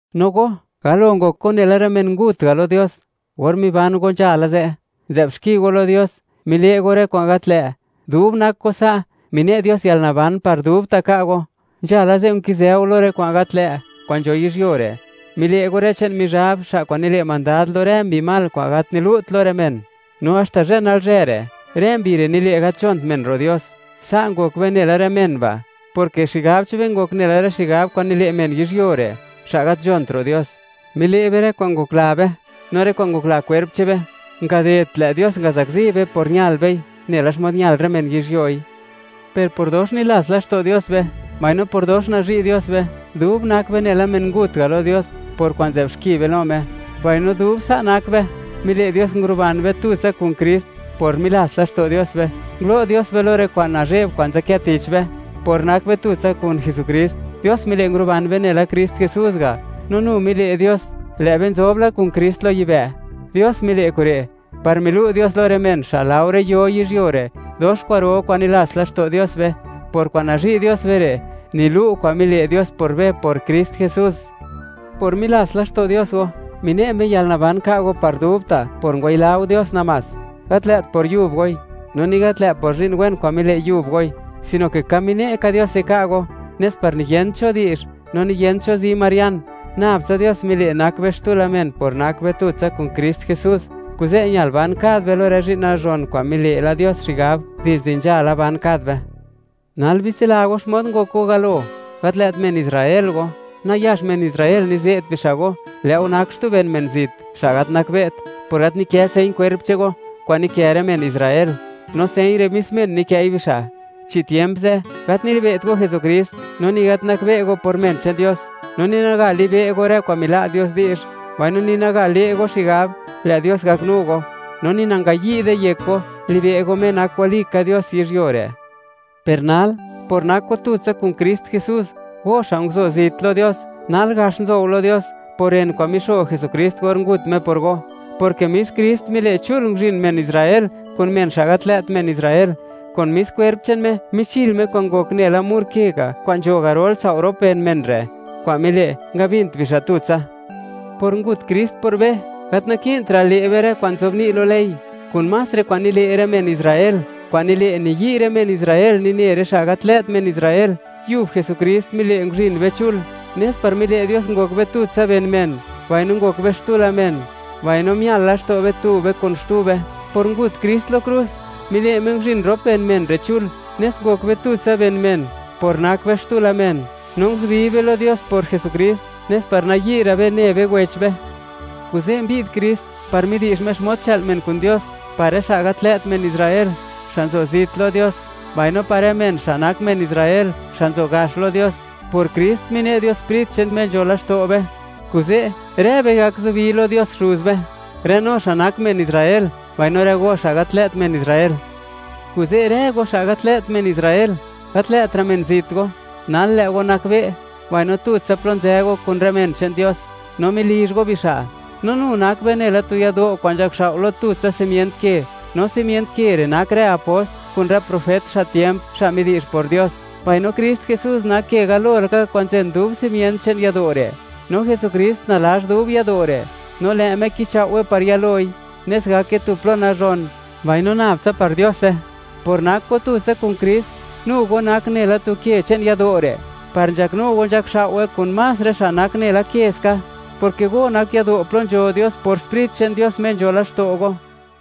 No go, galo ngok go nela rë men ngut ga' lo Dios. Or miban go nzhala ze', nzë'b xki go lo Dios, mile' go rë kwa'n gat lë'. Dub nak go sa', mine' Dios yalnaban par dubta' ka' go. Nzhala ze', nkizë go lo rë kwa'n gat lë' kwa'n nzho yizhyuo re'; mile' go rë che'n Mizhab, xa' kwa'n nile' mandad lo rë mbi mal kwa'n gat nilu't lo rë men, no haxta zhë nalzhë re', rë mbi re' nile' gat nzhont men ro' Dios. Sa' ngok be nela rë men ba', porke xigab che'n be ngok nela rë xigab kwa'n nile' men yizhyuo re', xa' gat nzhont ro' Dios. Mile' be rë kwa'n ngokla be, no rë kwa'n ngokla kwerp che'n be. Ngadedt lë' Dios ngazakzi be por ñal bei, nela xmod ñal rë men yizhyoi. Per por dox nilats laxto' Dios be, mbaino por dox nazhi' Dios be, dub nak be nela men ngut ga' lo Dios, por kwa'n nzë'b xki be lo Me, mbaino dub sa' nak be, mile' Dios nguruban be, tutsa kun Krist. Por milats laxto' Dios be, ngulo' Dios be lo rë kwa'n nazhe'b kwa'n nzadkë tich be. Por nak be tutsa kun Jesukrist, Dios mile' nguruban be nela Krist Jesús ga'; no nu mile' Dios, lë' be nzob la kun Krist lo yibë'. Dios mile' kure', par milu' Dios lo rë men, xa' laore yo yizhyuo re', dox kwa'ro kwa'n nilats laxto' Dios be, por kwa'n nazhi' Dios be re', nilu' kwa'n mile' Dios por be por Krist Jesús. Por milats laxto' Dios go, mine' Me yalnaban ka' go par dubta' por ngwayila go Dios namás; gat lë't por yub goi, no ni gat lë' por zhi'n wen kwa'n mile' yub goi, sino ke ka mine' ka Diose ka' go, nes par niyent cho di'zh, no niyent cho zi marian. Nabtsa Dios mile' nak be xtu men por nak be tutsa kun Krist Jesús, kuze' ñal ban kad be lo rë zhi'n nazhon kwa'n mile' la Dios xigab dizde nzhala ban kad be. Nal bitsila go, xmod ngok go galo. Gat lë't men Israel go. Nayax men Israel nize't bixa' go, lë' go nak xtu ben men zit, xa' gat nakbe't, por gat nikë señ kwerp che'n go kwa'n nikë rë men Israel; no señ re', mis men nikë'i bixa'. Chi tiemp ze', gat nilibe't go Jesukrist, no ni gat nakbe' go por men che'n Dios. No ni naga libe' go, rë kwa'n mila' Dios di'zh, mbaino ni naga le' go xigab, lë' Dios gaknu go, no ni nangayi'de yek go, libe' go Me nak walika Dios yizhyuo re'. Per nal, por nak go tutsa kun Krist Jesús, go xa' kwa'n nguzo zit lo Dios, nal gax nzo go lo Dios, por ren kwa'n mixo Jesukrist or ngut Me por go, porke mis Krist mile', chul nguzhin men Israel kun men xa' gat lë't men Israel; kun mis kwerp che'n Me, michil Me kwa'n ngok nela tu mur ke ga' kwa'n nzho garol sao' rop ben men re', kwa'n mile', ngabint bixa' tutsa. Por ngut Krist por be, gat naki'ntra' le' be rë kwa'n nzobni' lo ley, kun más rë kwa'n nile' rë men Israel, kwa'n nile', niyi' rë men Israel nine rë xa' gat lë't men Israel. Yub Jesukrist mile' nguzhin be chul, nes par mile' Dios ngok be tutsa ben men, mbaino ngok be xtu men mbaino mial la laxto' be tu be kun xtu be. Por ngut Krist lo krus, mile' Me nguzhin rop ben men re' chul, nes ngok be tutsa ben men por nak be xtu men, no nguzubi be lo Dios por Jesukrist, nes par nayi'ra' be ne be wech be. Kuze' mbi'd Krist, par midi'zh Me xmod chë'l men kun Dios; par rë xa' gat lë't men Israel, xa' nzo zit lo Dios, mbaino par rë men, xa' nak men Israel, xa' nzo gax lo Dios. Por Krist, mine' Dios Sprit che'n Me nzho laxto' be; kuze' rë be gak zubi lo Dios Xuz be, rë no xa' nak men Israel, mbaino rë go, xa' gat lë't men Israel. Kuze' rë go, xa' gat lë't men Israel, gat lë'tra' men zit go, nal lë' go nakbe'; mbaino tutsa plo nzë go kun rë men che'n Dios, no melizh go bixa'. No nu nak be nela tu yado' kwa'n nzhakxao' lo tutsa simient ke, no simient ke re' nak rë apost, kun rë profet xa' tiemp, xa' midi'zh por Dios; mbaino Krist Jesús nak ke galo laka kwa'n nzen dub simient che'n yado' re'. No Jesukrist nalazh dub yado' re', no lë' Me kichao'we par yaloi, nes gake tu plo nazhon, mbaino nab tsa par Diose. Por nak go tutsa kun Krist, nu go nak nela tu ke che'n yado' re', par nzhaknu go nzhakxao'we kun más rë xa' nak nela ke ska, porke go nak yado' plo nzho Dios por Sprit che'n Dios, Me nzho laxto' go.